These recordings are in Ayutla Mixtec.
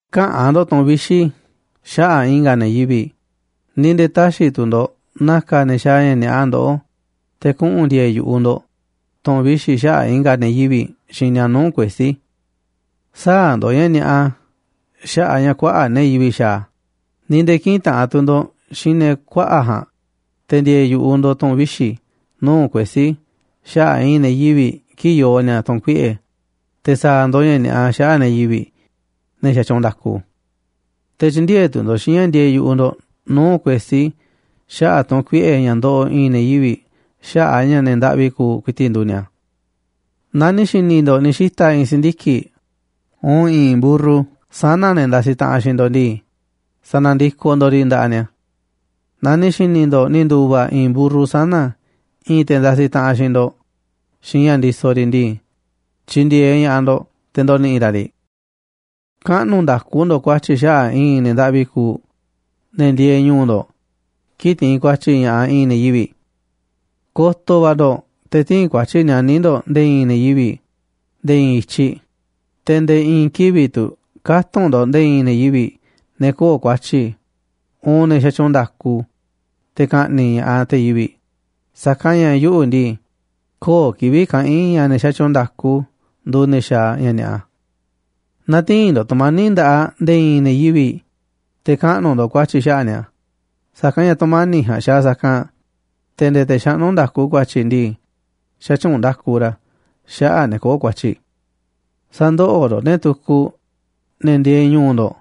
’Käꞌa̱n ndo̱ꞌ tu̱ꞌu̱n vixi̱ xaꞌa̱ꞌ i̱nga̱ ne̱ yivi̱ꞌ, ni̱ nde̱e̱ tä̱xi̱ tu̱ ndo̱ꞌ na̱ka̱ ne̱ xaaꞌ ña̱ ni̱a̱ꞌa ndoꞌó te̱ kuꞌu̱n ndi̱e̱e̱ yu̱ꞌuꞌ ndo̱ꞌ tu̱ꞌu̱n vixi̱ xaꞌa̱ꞌ i̱nga̱ ne̱ yivi̱ꞌ xiinꞌ ni̱a̱ nuu̱ꞌ kuesí. Sä̱a̱ ndo̱ꞌ ña̱ ni̱a̱ꞌa xaꞌa̱ꞌ a̱ ña̱ kuaꞌa̱ꞌ ne̱ yivi̱ꞌ xaaꞌ a̱, ni̱ nde̱e̱ kï̱ꞌi̱n taꞌanꞌ tu̱ ndo̱ꞌ xiinꞌ ne̱ kuaꞌa̱ꞌ ja̱a̱nꞌ te̱ ndi̱e̱e̱ yu̱ꞌuꞌ ndo̱ꞌ tu̱ꞌu̱n vixi̱ nuu̱ꞌ kuesí xaꞌa̱ꞌ i̱i̱n ne̱ yivi̱ꞌ kii̱ꞌ yoo ni̱a̱ tu̱n kuiꞌe̱, te̱ sa̱a̱ ndo̱ꞌ ña̱ ni̱a̱ꞌa xaꞌa̱ꞌ ne̱ yivi̱ꞌ, ne̱ xatyuunꞌ nda̱ku. Te̱ tyï̱ndi̱e̱eꞌ tu̱ ndo̱ꞌ xiinꞌ ña̱ ndieeꞌ yu̱ꞌuꞌ ndo̱ꞌ nuu̱ꞌ kuesí xaꞌa̱ꞌ tu̱n kuiꞌe̱ ña̱ ndoꞌoꞌ i̱i̱n ne̱ yivi̱ꞌ xaꞌa̱ꞌ a̱ ña̱ ne̱ ndaꞌvi kuuꞌ ku̱i̱ti̱ꞌ nduuꞌ ni̱a̱. ’Naaꞌ ni̱ xi̱ni̱ ndo̱ꞌ ni̱ xita̱ i̱i̱n si̱ndiki̱ꞌ uun i̱i̱n mburru sana̱ ne̱ ndasi taꞌanꞌ xiinꞌ ndo̱ꞌ ndii, sa̱na̱ndikoꞌ ndo̱ꞌ riꞌ nda̱ꞌaꞌ ni̱a̱. Naaꞌ ni̱ xi̱ni̱ ndo̱ꞌ ni̱ ndu̱va̱ i̱i̱n mburru sana̱ i̱i̱n te̱ ndasiꞌ taꞌanꞌ xiinꞌ ndo̱ꞌ xiinꞌ ña̱ ndisoꞌ riꞌ ndii, tyi̱ndi̱e̱eꞌ ña̱ꞌaꞌ ndo̱ꞌ te̱ ndo̱ni̱ꞌi̱ ra̱ riꞌ. ’Kaꞌnu̱ nda̱ku ndo̱ꞌ ku̱a̱tyi̱ xaꞌa̱ꞌ i̱i̱n ne̱ ndaꞌvi kuuꞌ ne̱ ndieeꞌ ñu̱u̱ ndo̱ꞌ kii̱ꞌ tiinꞌ ku̱a̱tyi̱ ña̱ꞌaꞌ i̱i̱n ne̱ yivi̱ꞌ. ’Ko̱to̱ va̱ ndo̱ꞌ te̱ tï̱i̱n ku̱a̱tyi̱ nianí ndo̱ꞌ nde̱e̱ i̱i̱n ne̱ yivi̱ꞌ nde̱e̱ i̱i̱n i̱tyiꞌ, te̱ nde̱e̱ i̱i̱n kivi̱ꞌ tu̱ kä̱tunꞌ ndo̱ꞌ nde̱e̱ i̱i̱n ne̱ yivi̱ꞌ, ne̱ köo̱ꞌ ku̱a̱tyi̱, uun ne̱ xatyuunꞌ nda̱ku, te̱ ka̱ꞌni̱ꞌ ña̱ꞌaꞌ te̱ yivi̱ꞌ. Sa̱kanꞌ ña̱ yuꞌu̱ ndii, köo̱ꞌ kivi̱ꞌ kaꞌa̱n i̱ ña̱ ne̱ xatyuunꞌ nda̱ku nduuꞌ ne̱ xaaꞌ ña̱ ni̱a̱ꞌa. ’Nä̱ti̱i̱n ndo̱ꞌ tu̱mani̱ꞌ nda̱ꞌaꞌ nde̱e̱ i̱i̱n ne̱ yivi̱ꞌ, te̱ kaꞌnu̱ ndo̱ꞌ ku̱a̱tyi̱ xaꞌa̱ꞌ ni̱a̱, sa̱kanꞌ ña̱ tu̱mani̱ꞌ ja̱a̱nꞌ xaaꞌ sa̱kanꞌ te̱ nde̱e̱ te̱ xaꞌnú nda̱ku ku̱a̱tyi̱ ndii, xätyuunꞌ nda̱ku ra̱ xaꞌa̱ꞌ ne̱ köo̱ꞌ ku̱a̱tyi̱. ’Sä̱ndoꞌoꞌ ndo̱ꞌ ne̱ tukuꞌ, ne̱ ndieeꞌ ñu̱u̱ ndo̱ꞌ,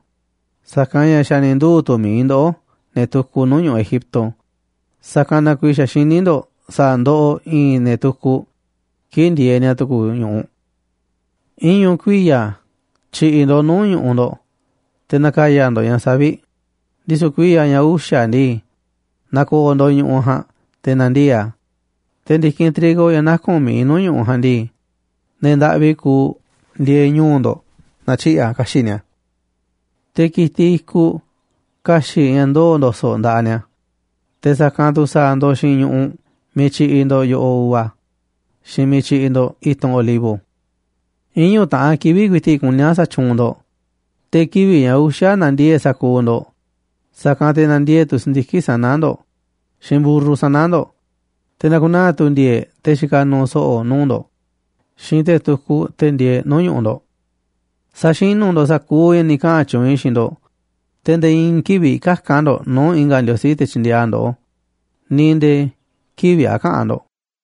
sa̱kanꞌ ña̱ xa̱ ni̱ nduu̱ tu̱ mi̱iꞌ ndoꞌó ne̱ tukuꞌ nuu̱ꞌ ñu̱ꞌuꞌ Egipto, sa̱kanꞌ na kuiiꞌ xa̱ xiní ndo̱ꞌ sa̱a̱ ndoꞌoꞌ i̱i̱n ne̱ tukuꞌ kii̱ꞌ ndieeꞌ ni̱a̱ tu̱ku̱ ñu̱ꞌuꞌ. ’Iñu̱ kuiya̱ tyi̱ꞌi̱ ndo̱ꞌ nuu̱ꞌ ñu̱ꞌuꞌ ndo̱ꞌ te̱ na̱ka̱ya̱ ndo̱ꞌ ña̱ savi̱ꞌ, ndisu̱ kuiya̱ ña̱ uxa̱ ndii, na̱ko̱o̱ ndo̱ꞌ ñu̱ꞌuꞌ ja̱a̱nꞌ te̱ na̱ndiee̱ꞌ a̱, te̱ ndi̱kinꞌ trigo ña̱ naku̱n mi̱iꞌ nuu̱ꞌ ñu̱ꞌuꞌ ja̱a̱nꞌ ndii, ne̱ ndaꞌvi kuuꞌ ndieeꞌ ñu̱u̱ ndo̱ꞌ na̱tyiꞌi̱ꞌ a̱ ka̱xi̱ꞌ ni̱a̱. Te̱ ki̱tiꞌ i̱kuꞌ ka̱xi̱ꞌ ña̱ ndoo̱ ndo̱so̱ꞌ nda̱ꞌaꞌ ni̱a̱, te̱ sa̱kanꞌ tu̱ sa̱a̱ ndo̱ꞌ xiinꞌ ñu̱ꞌuꞌ miiꞌ tyiꞌiꞌ ndo̱ꞌ yo̱ꞌoꞌ uva xiinꞌ miiꞌ tyiꞌiꞌ ndo̱ꞌ i̱tunꞌ olivo. ’Iñu̱ taꞌan kivi̱ꞌ ku̱i̱ti̱ꞌ kuní a̱ sa̱tyuunꞌ ndo̱ꞌ, te̱ kivi̱ꞌ ña̱ uxa̱ na̱ndiee̱ꞌ sa̱kuuꞌ ndo̱ꞌ, sa̱kanꞌ te̱ na̱ndiee̱ꞌ tu̱ si̱ndiki̱ꞌ sana̱ ndo̱ꞌ xiinꞌ mburru sana̱ ndo̱ꞌ, te̱ na̱ku̱naa̱ tu̱ ndi̱e̱e̱ꞌ te̱ xikaꞌ nuuꞌ so̱ꞌo̱ nuu̱ꞌ ndo̱ꞌ xiinꞌ te̱ tukuꞌ, te̱ ndieeꞌ nuu̱ꞌ ñu̱ꞌuꞌ ndo̱ꞌ. ’Sa̱xinu̱ ndo̱ꞌ sa̱kuuꞌ ña̱ ni̱ kaꞌa̱n tyuunꞌ i̱ xiinꞌ ndo̱ꞌ, te̱ nde̱e̱ i̱i̱n kivi̱ꞌ käka̱n ndo̱ꞌ nuu̱ꞌ i̱nga̱ ndiosí te̱ tyi̱ndi̱e̱eꞌ a̱ ndoꞌó, ni̱ nde̱e̱ kivi̱ꞌ a̱ käꞌa̱n ndo̱ꞌ.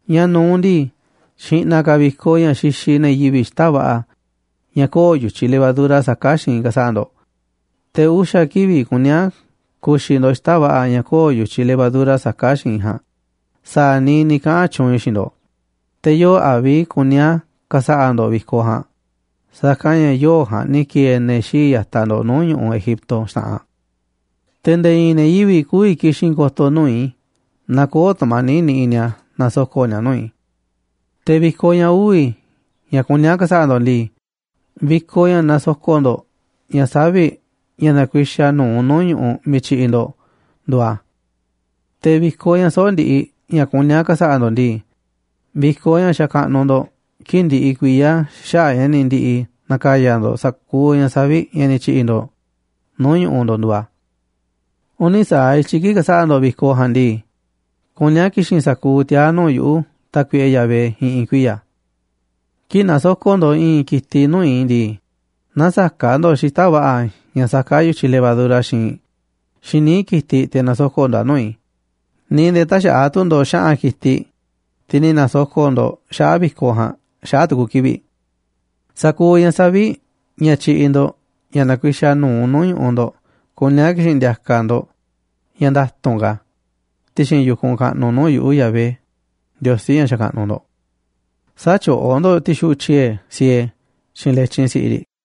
Ña̱ nu̱uꞌ ndii, xi̱ꞌna̱ ka̱ vi̱koꞌ ña̱ xixiꞌ ne̱ yivi̱ꞌ xita̱ꞌ va̱ꞌa̱ ña̱ köo̱ꞌ yu̱tyiꞌ levadura saká xiinꞌ ka̱sa̱ꞌa̱ ndo̱ꞌ. Te̱ uxa̱ kivi̱ꞌ kuní a̱ ku̱xi̱ ndo̱ꞌ xita̱ꞌ va̱ꞌa̱ ña̱ köo̱ꞌ yu̱tyiꞌ levadura saká xiinꞌ ja̱a̱nꞌ sa̱a̱ niiꞌ ni̱ kaꞌa̱n tyuunꞌ i̱ xiinꞌ ndo̱ꞌ. Te̱ yoo̱ꞌ Abib kuní a̱ ka̱sa̱ꞌa̱ ndo̱ꞌ vi̱koꞌ ja̱a̱nꞌ, sa̱kanꞌ ña̱ yoo̱ꞌ ja̱a̱nꞌ ni̱ ki̱e̱e̱ ne̱ xii̱ꞌ ya̱taꞌ ndo̱ꞌ nuu̱ꞌ ñu̱ꞌuꞌ Egipto xta̱ꞌanꞌ. Te̱ nde̱e̱ i̱i̱n ne̱ yivi̱ꞌ kü̱vi̱ ki̱xi̱n ko̱to̱ nuu̱ꞌ i̱ naaꞌ köo̱ꞌ tu̱mani̱ꞌ niꞌiꞌ ni̱a̱ na̱soko̱ꞌni̱a̱ nuu̱ꞌ i̱. ’Te̱ vi̱koꞌ ña̱ uvi̱ ña̱ kuní a̱ ka̱sa̱ꞌa̱ ndo̱ꞌ ndii, vi̱koꞌ ña̱ nasoko̱ꞌ ndo̱ꞌ ña̱ savi̱ꞌ ña̱ nakuixaꞌ nu̱uꞌ nuu̱ꞌ ñu̱ꞌuꞌ miiꞌ tyiꞌiꞌ ndo̱ꞌ nduuꞌ a̱. ’Te̱ vi̱koꞌ ña̱ soꞌo̱ꞌ ndiꞌiꞌ ña̱ kuní a̱ ka̱sa̱ꞌa̱ ndo̱ꞌ ndii, vi̱koꞌ ña̱ xakaꞌnuꞌ ndo̱ꞌ kii̱ꞌ ndiꞌiꞌ kuiya̱ xaꞌa̱ꞌ ña̱ ni̱ ndi̱ꞌi̱ na̱ka̱ya̱ ndo̱ꞌ sa̱kuuꞌ ña̱ savi̱ꞌ ña̱ ni̱ tyi̱ꞌi̱ ndo̱ꞌ nuu̱ꞌ ñu̱ꞌuꞌ ndo̱ꞌ nduuꞌ a̱. Uni̱ sa̱aꞌ i̱tyiꞌ kii̱ꞌ ka̱sa̱ꞌa̱ ndo̱ꞌ vi̱koꞌ ja̱a̱nꞌ ndii, kuní a̱ ki̱xi̱n sa̱kuuꞌ tiaa̱ nuu̱ꞌ yuꞌu̱, Tákuiꞌe Yahvé, i̱ꞌi̱n kuiya̱. ’Kii̱ꞌ nasoko̱ꞌ ndo̱ꞌ i̱i̱n ki̱tiꞌ nuu̱ꞌ i̱ ndii, nä̱saka̱ꞌ ndo̱ꞌ xita̱ꞌ va̱ꞌa̱ ña̱ saká yu̱tyiꞌ levadura xiinꞌ, xiinꞌ níiꞌ ki̱tiꞌ te̱ na̱soko̱ꞌ ndo̱ꞌ a̱ nuu̱ꞌ i̱, ni̱ nde̱e̱ tä̱xa̱ꞌa̱ tu̱ ndo̱ꞌ xa̱ꞌa̱n ki̱tiꞌ, tiꞌ ni̱ na̱soko̱ꞌ ndo̱ꞌ xaꞌa̱ꞌ vi̱koꞌ ja̱a̱nꞌ, xaꞌa̱ꞌ tu̱ku̱ kivi̱ꞌ. ’Sa̱kuuꞌ ña̱ savi̱ꞌ ña̱ tyiꞌiꞌ ndo̱ꞌ ña̱ nakuixaꞌ nu̱uꞌ nuu̱ꞌ ñu̱ꞌuꞌ ndo̱ꞌ kuní a̱ ki̱xi̱n ndi̱a̱ka̱ ndo̱ꞌ ña̱ nda̱tu̱nꞌ ka̱ ti̱xi̱n yu̱kunꞌ kaꞌnuꞌ nuu̱ꞌ yuꞌu̱, Yahvé, Ndiosí ña̱ xakaꞌnuꞌ ndo̱ꞌ. ’Sä̱tyoꞌó ndo̱ꞌ ti̱xuꞌu̱ꞌ tyiee̱ siee xiinꞌ letyin si̱ꞌiꞌ riꞌ.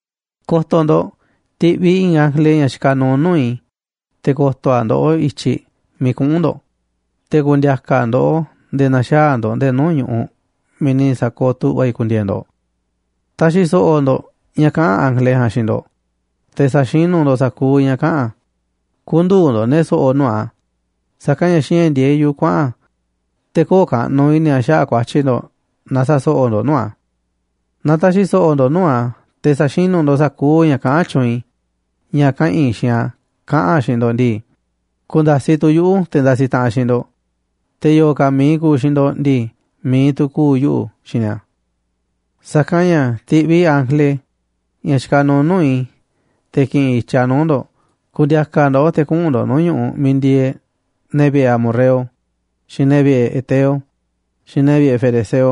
’Ko̱to̱ ndo̱ꞌ, ti̱ꞌviꞌ i̱ i̱i̱n ángele ña̱ xikaꞌ nuuꞌ nuu̱ꞌ i̱ te̱ ko̱to̱ a̱ ndoꞌó i̱tyiꞌ miiꞌ kuꞌu̱n ndo̱ꞌ, te̱ ku̱ndi̱a̱ka̱ a̱ ndoꞌó nde̱e̱ na̱xaa̱ ndo̱ꞌ nde̱e̱ nuu̱ꞌ ñu̱ꞌuꞌ miiꞌ ni̱ sa̱kooꞌ tu̱ꞌva̱ i̱ ku̱ndi̱e̱e̱ ndo̱ꞌ. Ta̱xi̱ so̱ꞌo̱ ndo̱ꞌ ña̱ kaꞌa̱n ángele ja̱a̱nꞌ xiinꞌ ndo̱ꞌ, te̱ sa̱xinu̱ ndo̱ꞌ sa̱kuuꞌ ña̱ kaꞌa̱n a̱. Kü̱ndu̱u̱ ndo̱ꞌ ne̱ so̱ꞌo̱ nuu̱ꞌ a̱, sa̱kanꞌ ña̱ xiinꞌ ña̱ ndi̱e̱eꞌ yuꞌu̱ kuaꞌa̱n a̱ te̱ köo̱ꞌ kaꞌnuꞌ i̱ni̱ a̱ xaꞌa̱ꞌ ku̱a̱tyi̱ ndo̱ꞌ naaꞌ sa̱so̱ꞌo̱ ndo̱ꞌ nuu̱ꞌ a̱. Naaꞌ ta̱xi̱ so̱ꞌo̱ ndo̱ꞌ nuu̱ꞌ a̱, te̱ sa̱xinu̱ ndo̱ꞌ sa̱kuuꞌ ña̱ kaꞌán tyuunꞌ i̱ ña̱ kaꞌa̱n i̱ xiinꞌ a̱ kaꞌa̱n a̱ xiinꞌ ndo̱ꞌ ndii, ku̱nda̱siꞌ tu̱ yuꞌu̱ te̱ ndasiꞌ taꞌanꞌ xiinꞌ ndo̱ꞌ, te̱ yo̱o̱ ka̱ mi̱iꞌ ku̱u̱ xiinꞌ ndo̱ꞌ ndii, mi̱iꞌ tu̱ ku̱u̱ yuꞌu̱ xiinꞌ ni̱a̱. Sa̱kanꞌ ña̱ ti̱ꞌviꞌ i̱ ángele, ña̱ xikaꞌ nuuꞌ nuu̱ꞌ i̱, te̱ ki̱ꞌi̱n i̱tyiꞌ a̱ nuu̱ꞌ ndo̱ꞌ ku̱ndi̱a̱ka̱ a̱ ndoꞌó te̱ kuꞌu̱n ndo̱ꞌ nuu̱ꞌ ñu̱ꞌuꞌ miiꞌ ndieeꞌ ne̱ vi̱ꞌe̱ amorreo, xiinꞌ ne̱ vi̱ꞌe̱ heteo, xiinꞌ ne̱ vi̱ꞌe̱ ferezeo,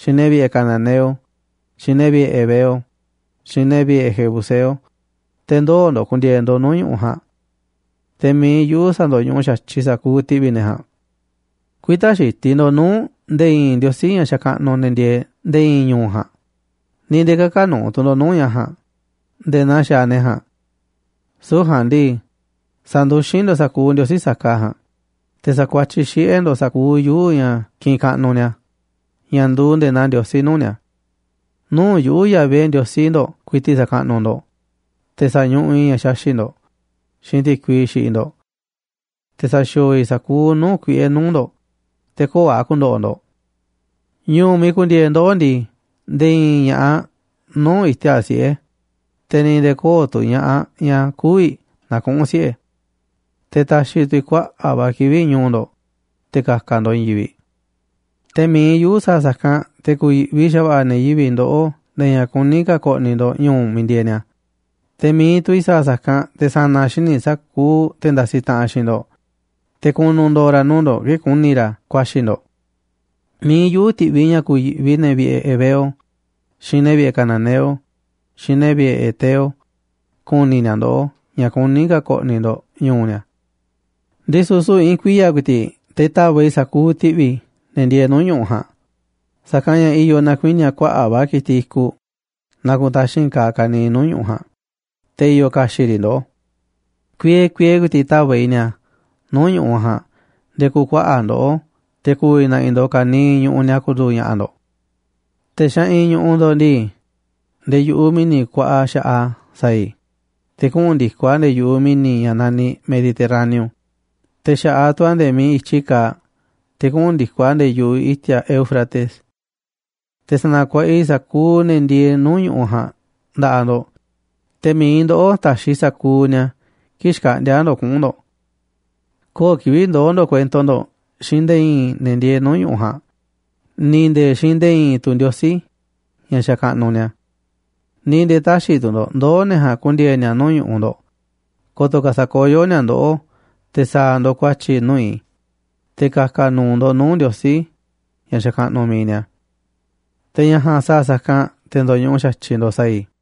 xiinꞌ ne̱ vi̱ꞌe̱ cananeo, xiinꞌ ne̱ vi̱ꞌe̱ heveo, xiinꞌ ne̱ vi̱ꞌe̱ jebuseo, te̱ ndoo̱ ndo̱ꞌ ku̱ndi̱e̱e̱ ndo̱ꞌ nuu̱ꞌ ñu̱ꞌuꞌ ja̱a̱nꞌ. Te̱ mi̱iꞌ yuꞌu̱ sa̱ndo̱ñuꞌuꞌ xa̱tyiꞌ sa̱kuuꞌ ti̱ꞌvi̱ ne̱ ja̱a̱nꞌ. Kü̱i̱ta̱ xitiꞌ ndo̱ꞌ nuu̱ꞌ nde̱e̱ i̱i̱n ndiosí ña̱ xakaꞌnuꞌ ne̱ ndieeꞌ nde̱e̱ i̱i̱n ñu̱u̱ ja̱a̱nꞌ, ni̱ nde̱e̱ kä̱ka̱ nu̱u̱ tu̱ ndo̱ꞌ nuu̱ꞌ ña̱ ja̱a̱nꞌ nde̱e̱ naa xaaꞌ ne̱ ja̱a̱nꞌ. Süu̱ꞌ ja̱a̱nꞌ ndii, sa̱nduxín ndo̱ꞌ sa̱kuuꞌ ndiosí saka ja̱a̱nꞌ, te̱ sa̱kuatyiꞌ xiꞌe̱ ndo̱ꞌ sa̱kuuꞌ yuu̱ꞌ ña̱ kiꞌinꞌ kaꞌnuꞌ ni̱a̱, ña̱ nduuꞌ nde̱e̱ naa ndiosí nuu̱ꞌ ni̱a̱. ’Nuu̱ꞌ yuꞌu̱, Yahvé, Ndiosí ndo̱ꞌ ku̱i̱ti̱ꞌ sa̱kaꞌnuꞌ ndo̱ꞌ, te̱ sa̱ñuꞌuꞌ i̱ ña̱ xaxi̱ꞌ ndo̱ꞌ xiinꞌ ti̱kui xiꞌiꞌ ndo̱ꞌ. Te̱ sa̱xi̱o̱o̱ i̱ sa̱kuuꞌ nuu̱ꞌ kuiꞌe̱ nuu̱ꞌ ndo̱ꞌ, te̱ köo̱ꞌ a̱ ku̱ndo̱ꞌo̱ ndo̱ꞌ. Ñu̱u̱ miiꞌ ku̱ndi̱e̱e̱ ndoꞌó ndii, nde̱e̱ i̱i̱n ña̱ꞌaꞌ nü̱u̱ iti̱a̱ꞌ siꞌe̱, te̱ ni̱ nde̱e̱ köo̱ꞌ tu̱ ña̱ꞌaꞌ ñaꞌ kü̱vi̱ na̱kuꞌu̱n siꞌe̱. Te̱ ta̱xi̱ tu̱ i̱ kuaꞌa̱ꞌ va̱ kivi̱ꞌ ñu̱u̱ ndo̱ꞌ te̱ ka̱ka̱ ndo̱ꞌ i̱i̱n yivi̱ꞌ. ’Te̱ mi̱iꞌ yuꞌu̱ sa̱a̱ sa̱kanꞌ, te̱ ku̱yi̱ꞌvi xa̱va̱ꞌa̱ ne̱ yivi̱ꞌ ndoꞌó nde̱e̱ ña̱ kuní ka̱ ko̱ꞌni̱ ndo̱ꞌ ñu̱u̱ miiꞌ ndieeꞌ ni̱a̱, te̱ mi̱iꞌ tu̱ i̱ sa̱a̱ sa̱kanꞌ te̱ sa̱na̱ xíniꞌ sa̱kuuꞌ te̱ ndasiꞌ taꞌanꞌ xiinꞌ ndo̱ꞌ, te̱ ku̱nu̱ ndo̱o̱ ra̱ nuu̱ꞌ ndo̱ꞌ kii̱ꞌ ku̱ni̱ ra̱ ku̱a̱xi̱ ndo̱ꞌ. Mi̱iꞌ yuꞌu̱ ti̱ꞌviꞌ ña̱ ku̱yi̱ꞌvi ne̱ vi̱ꞌe̱ heveo, xiinꞌ ne̱ vi̱ꞌe̱ cananeo, xiinꞌ ne̱ vi̱ꞌe̱ heteo ku̱ni̱ ni̱a̱ ndoꞌó ña̱ kuní ka̱ ko̱ꞌni̱ ndo̱ꞌ ñu̱u̱ ni̱a̱. Ndisu̱ süu̱ꞌ i̱i̱n kuiya̱ ku̱i̱ti̱ꞌ te̱ ta̱va̱ꞌ i̱ sa̱kuuꞌ ti̱ꞌvi̱ ne̱ ndieeꞌ nuu̱ꞌ ñu̱ꞌuꞌ ja̱a̱nꞌ, sa̱kanꞌ ña̱ i̱yo̱ na̱kuini̱a̱ kuaꞌa̱ꞌ va̱ ki̱tiꞌ i̱kuꞌ naaꞌ kutaxi̱nꞌ kaaꞌ ka̱niiꞌ nuu̱ꞌ ñu̱ꞌuꞌ ja̱a̱nꞌ te̱ i̱yo̱ ka̱xi̱ꞌ riꞌ ndoꞌó. Kuiee kuiee ku̱i̱ti̱ꞌ ta̱va̱ꞌ i̱ ni̱a̱ nuu̱ꞌ ñu̱ꞌuꞌ ja̱a̱nꞌ nde̱e̱ ku̱kuaꞌa̱ꞌ ndoꞌó, te̱ ku̱vi̱ na̱ꞌi̱ ndo̱ꞌ ka̱niiꞌ ñu̱ꞌuꞌ ni̱a̱ ku̱ndu̱u̱ ña̱ꞌa̱ ndo̱ꞌ. Te̱ xeꞌinꞌ ñu̱ꞌuꞌ ndo̱ꞌ ndii, nde̱e̱ yu̱ꞌuꞌ mi̱ni̱ kuaꞌa xa̱ꞌaꞌ a̱ sa̱a̱ i̱, te̱ kuꞌu̱n ndi̱koꞌ a̱ nde̱e̱ yu̱ꞌuꞌ mi̱ni̱ ña̱ naniꞌ Mediterraneo, te̱ xa̱ꞌaꞌ tu̱ a̱ nde̱e̱ miiꞌ i̱tyi kaaꞌ te̱ kuꞌu̱n ndi̱koꞌ a̱ nde̱e̱ yu̱ꞌuꞌ i̱ti̱a̱ Éufrates. Te̱ sa̱na̱kuaꞌa i̱ sa̱kuuꞌ ne̱ ndieeꞌ nuu̱ꞌ ñu̱ꞌuꞌ ja̱a̱nꞌ nda̱ꞌaꞌ ndo̱ꞌ, te̱ mi̱iꞌ ndoꞌó ta̱xiꞌ sa̱kuuꞌ ni̱a̱ kii̱ꞌ xkaꞌndi̱a̱ ndo̱ꞌ kuꞌu̱n ndo̱ꞌ. ’Köo̱ꞌ kivi̱ꞌ ndoo̱ ndo̱ꞌ kuento ndo̱ꞌ xiinꞌ nde̱e̱ i̱i̱n ne̱ ndieeꞌ nuu̱ꞌ ñu̱ꞌuꞌ ja̱a̱nꞌ, ni̱ nde̱e̱ xiinꞌ nde̱e̱ i̱i̱n tu̱ ndiosí ña̱ xakaꞌnuꞌ ni̱a̱. Ni̱ nde̱e̱ tä̱xi̱ tu̱ ndo̱ꞌ ndoo̱ ne̱ ja̱a̱nꞌ ku̱ndi̱e̱e̱ ni̱a̱ nuu̱ꞌ ñu̱ꞌuꞌ ndo̱ꞌ, ko̱to̱ ka̱ sa̱koyó ni̱a̱ ndoꞌó te̱ sa̱a̱ ndo̱ꞌ ku̱a̱tyi̱ nuu̱ꞌ i̱, te̱ ka̱ka̱ nu̱u̱ ndo̱ꞌ nuu̱ꞌ ndiosí ña̱ xakaꞌnuꞌ mi̱iꞌ ni̱a̱. Te̱ ña̱ ja̱a̱nꞌ sa̱a̱ sa̱kanꞌ te̱ ndo̱ñuꞌuꞌ xa̱tyiꞌ ndo̱ꞌ sa̱a̱ i̱.